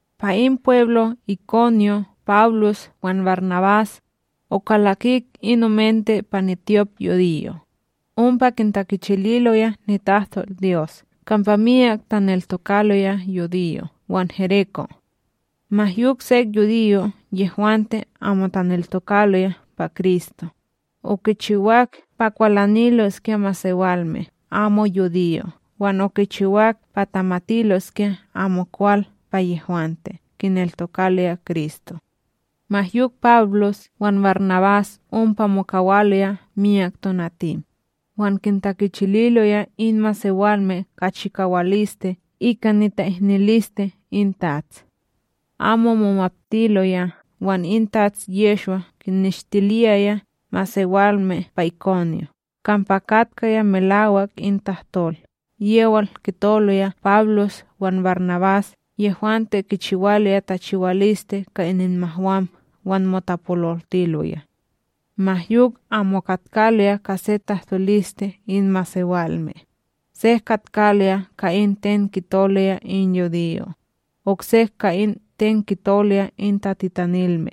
Pa in pweblo Ikonyon Pawlos wan BarNabás, okalakik in omente pa nityopYudiyo, ompa kintakichililoya nitahtolDyos kampa miyak taneltokaloya yudiyo' wan gereko'. Ma yok sek yudiyo' yehwante amo taneltokaloya pa Kristo, okichiwak pa kwalaniloskya masewalme amo yudiyo' wan okichiwak pa tamatiloskya amokwal pa yehwante kineltokaloya Kristo. Ma yok Pawlos wan BarNabás ompa mokawaloya miyak tonatim, wan kintakichililoya in masewalme ka chikawaliste ika nita'ihniliste in TATS; amo momaptiloya wan in Tats Yehshwa kinneshtiliyaya masewalme pa Ikonyon kampa katkaya melawak in tahtol yewal kitoloya Pawlos wan BarNabás yehwante kichiwaloya tachiwaliste ka ininmahwam wan motapololtiloya. Ma yok amo katkaloya ka se tahtoliste in masewalme, sek katkaloya ka in ten kitoloya in yudiyo', oksek ka in ten kitoloya in tatitanilme.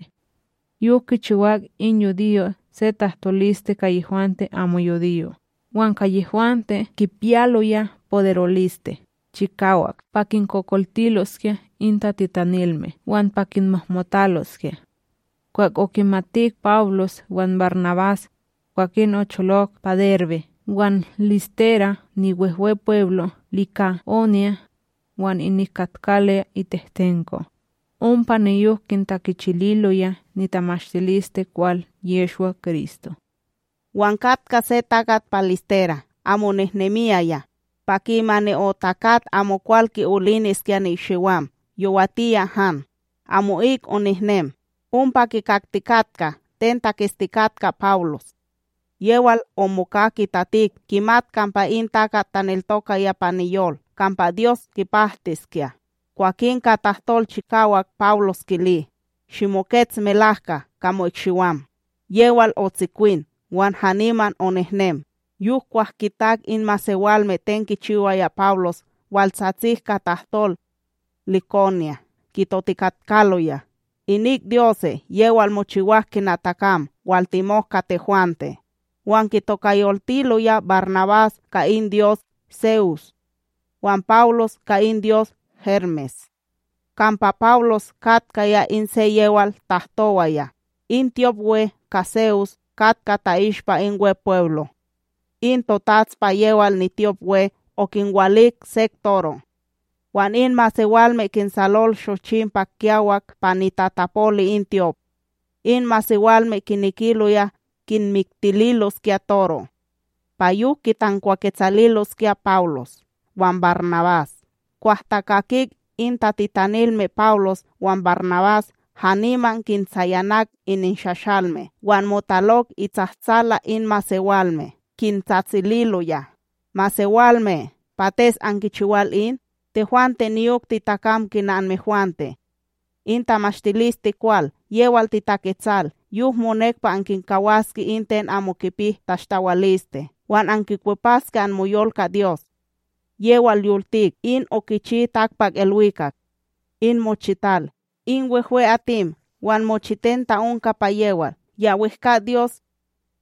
Yok kichiwak in yudiyo' se tahtoliste ka yehwante amo yudiyo' wan ka yehwante kipiyaloya poderoliste kichiwak pa kinkokoltiloskya in tatitanilme wan pa kinmohmotaloskya. Kwah okimatik Pawlos wan BarNabás, kwakin ocholok pa Derbe wan Listera niWehwepweblo Lika'onya, wan inik katkaloya itehtenko, ompa niyok kintakichililoya nitamashtilisteKwal Yehshwa-Kristo. Wan katkaya se takat pa Listera amo nihnemiyaya. Pa kimani otakat amokwal ki'oliniskya ni'ikshiwam yowatiya han, amo'ik onihnem. Ompa kikaktikatka ten taketstikatka Pawlos, yewal omoka kitatik kimat kampa in takat taneltokaya pa niyol kampa Dyos kipahtiskya. Kwakin ka tahtol chikawak Pawlos kili: —Shimokets melahka ka mo'ikshiwam. Yewal otsikwin wan haniman onehnem. Yok kwah kitak in masewalme ten kichiwaya Pawlos, waltsatsik ka tahtol Lika'onya, kitotikatkaloya: —Inik dyose' yewal mochiwak kina takam waltimok ka tehwante! Wan kitokayoltiloya BarNabás ka in dyos Se'us, wan Pawlos ka in dyos Hermes kampa Pawlos katkaya in se yewal tahtowaya. In tyopWe ka Se'us, katka ta'ishpa in Wepweblo, in totats pa yewal nityopWe okinwalik sek toro' wan in masewalme kinsalol shochim; pa kiyawak pa nitatapoli in tyop in masewalme kinekiloya kinmiktililoskya toro' pa yok kitankwaketsaliloskya Pawlos wan BarNabás. Kwah takakik in tatitanilme Pawlos wan BarNabás haniman kintsayanak ininshashalme, wan motalok itsahtsala in myak masewalme, kintsatsililoya: —Masewalme! Pates ankichiwal in? Tehwante niyok titakam kina anmehwante, in tamashtilisteKwal yewal titaketsal yok monek pa ankinkawaske in ten amo kipi tashtawaliste wan ankikwepaske anmoyol ka Dyos, yewal yoltik in okichi takpakIlwikak, in mochital, in wehwe'atim wan mochiten ta'onka pa yewal. Ya wehkA Dyos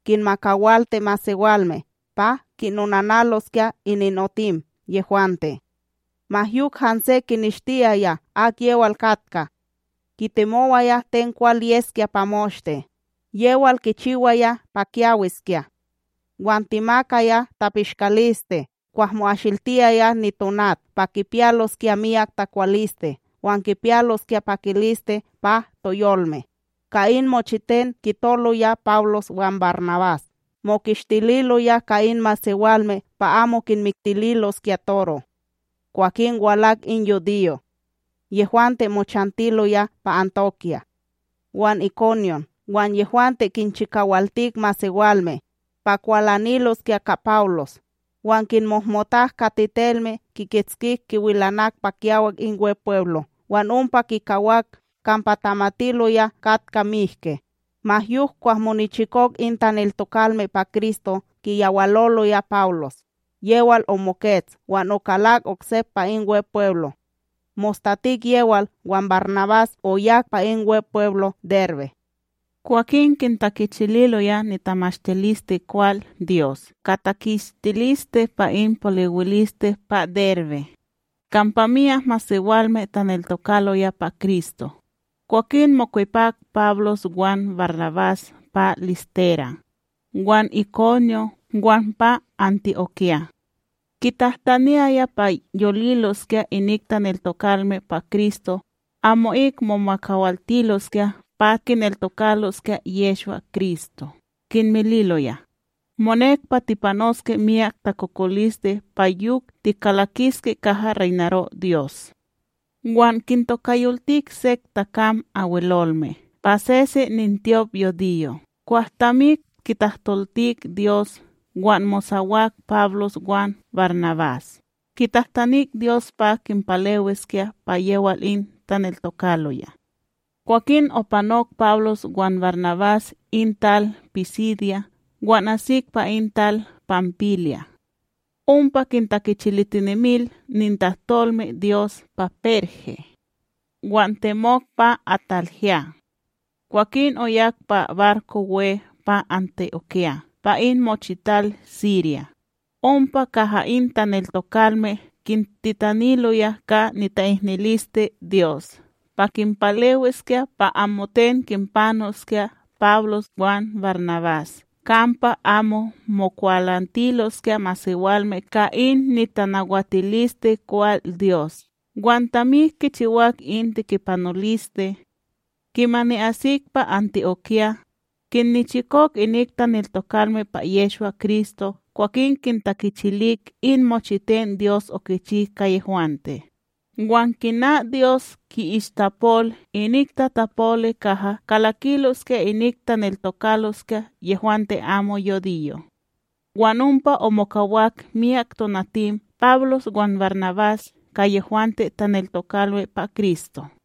kinmakawalti masewalme pa kinonanaloskya ininotim yehwante, ma yok hanse kineshtiyaya akyewal katka, kitimowaya ten kwal yeskya pa moshte. Yewal kichiwaya pa kyawiskya wan timakaya tapishkaliste kwah mo'asiltiyaya nitonat pa kipiyaloskya miyak takwaliste wan kipiyaloskya pakiliste pa toyolme. Ka in mochiten kitoloya Pawlos wan BarNabás mokistililoya ka in masewalme pa amo kinmiktililoskya toro'. Kwakin walak in yudiyo' yehwante mochantiloya pa Anti'okya wan Ikonyon, wan yehwante kinchikawaltik masewalme, pa kwalaniloskya ka Pawlos. Wan kimohmotak ka tetelme kikitskik kiwilanak pa kiyawak in Wepweblo wan ompa kikawak kampa tamatiloya katka mihke. Ma yok kwah monichikok in taneltokalme pa Kristo kiyawaloloya Pawlos, yewal omokets wan okalak oksep pa in Wepweblo; Mostatik yewal wan BarNabás oyak pa in Wepweblo Derbe. Kwakin kintakichililoya nitamashtilisteKwal Dyos ka takistiliste pa in poliwiliste pa Derbe, kampa myak masewalme taneltokaloya pa Kristo, kwakin mokwepak Pawlos wan BarNabás pa Listera, wan Ikonyon wan pa Anti'okya. Kintahtaniyaya pa yoliloskya inik taneltokalme pa Kristo amo'ik momakawaltiloskya pa kineltokaloskya Yehshwa-Kristo kinmililoya, monek pa tipanoske miyak takokoliste pa yok tikalakiske kaha reynaro Dyos. Wan kintokayoltik sek takam Abwelolme pa sesen nintyop yudiyo' kwah tamik kitahtoltik Dyos wan mosawak Pawlos wan BarNabás kitahtanik Dyos pa kinpalewiskya pa yewal in taneltokaloya. Kwakin opanok Pawlos wan BarNabás in tal Pisidya wan asik pa in tal Panpilya. Ompa kintakichilitinemil nitahtolmeDyos pa Perge, wan temok pa AtalYah. Kwakin oyak pa barko pa Anti'okya pa in mochital Sirya, ompa kaha in taneltokalme kintitaniloya ka nita'ihniliste Dyos pa kinpalewiskya pa amoten kinpanoskya Pawlos wan BarNabás kampa amo mokwalantiloskya masewalme ka in nitanawatilisteKwal Dyos wan tamik kichiwak in tekipanoliste. Kimani asik pa Anti'okya, kinnichikok inik taneltokalme pa Yehshwa-Kristo kwakin kintakichilik in mochiten Dyos okichi ka yehwante, wan kina Dyos ki'ishtapol inik tatapoli kaha kalakiloskya inik taneltokaloskya yehwante amo yudiyo'. Wan ompa omokawak miyak tonatim Pawlos wan BarNabás ka yehwante taneltokalme pa Kristo.